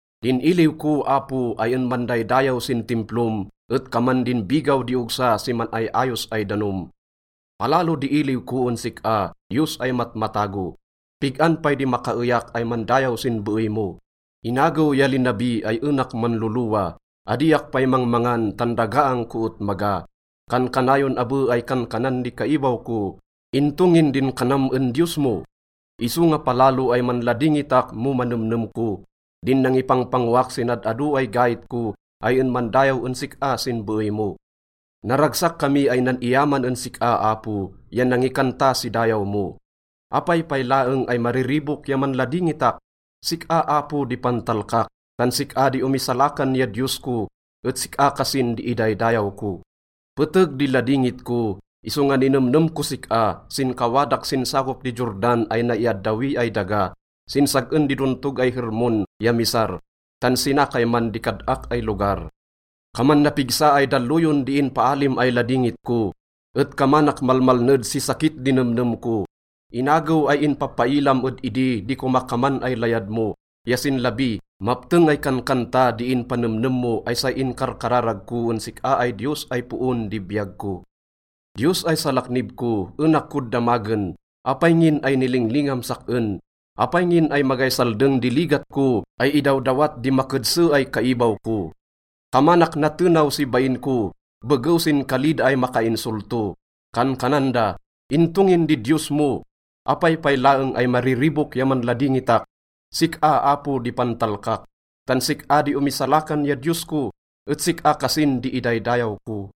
Din iliw ko, Apo, ay en mandaydayaw sin Timplom et kaman din bigaw di ogsa si man-ay-ayos ay danom. Palalo di iliw ko en sik-a, Diyos ay matmatago. Pig-an pay di makaeyak ay mandayaw sin beey mo? Inagew ya linabi ay enak manlolowa, adiak pay mangmangan tan dagaang ko et maga. Kankanayon abe ay kankanan di kaibaw ko, “Into ngin din kanam en Diyos mo?” Isonga palalo ay manladingitak mo manemnem ko din nangipangpangoak sin ad-ado ay gait ko ay en mandayaw en sik-a sin beey mo. Naragsak kami ay nan-iyaman en sik-a, Apo, ya nangikanta si dayaw mo. Apay pay laeng ay mariribok ya manladingitak? Sik-a, Apo di pantalkak, tan sik-a di omisalakan ya Diyos ko et sik-a kasin di idaydayaw ko. Peteg di ladingit ko, isonga ninemnem kos sik-a sin kawadak sin sakop di Jordan ay naiaddawi ay daga, sin sag-en di dontog ay Hermon ya Mizar, tan sina kayman di kad-ak ay lugar. Kaman napigsa ay dalloyon di inpaalim ay ladingit ko, et kamanak malmalned si sakit di nemnem ko. Inagew ay inpapailam ed idi di komakaman ay layad mo, ya sin labi, mapteng ay kankanta di inpanemnem mo ay say inkarkararag ko en sik-a ay Diyos ay poon di biyag ko. Diyos ay salaknib ko, enak kod damagen, “Apay ngin ay nilinglingam sak-en? Apay ngin ay magay saldeng di ligat ko ay idawdawat di makedse ay kaibaw ko?” Kamanak natenaw si bain ko begew sin kali da ay makainsolto. Kankanan da, “Into ngin di Diyos mo?” Apay pay laeng ay mariribok ya manladingitak? Sik-a, Apo di pantalkak, tan sik-a di omisalakan ya Diyos ko, et sik-a kasin di idaydayaw ko.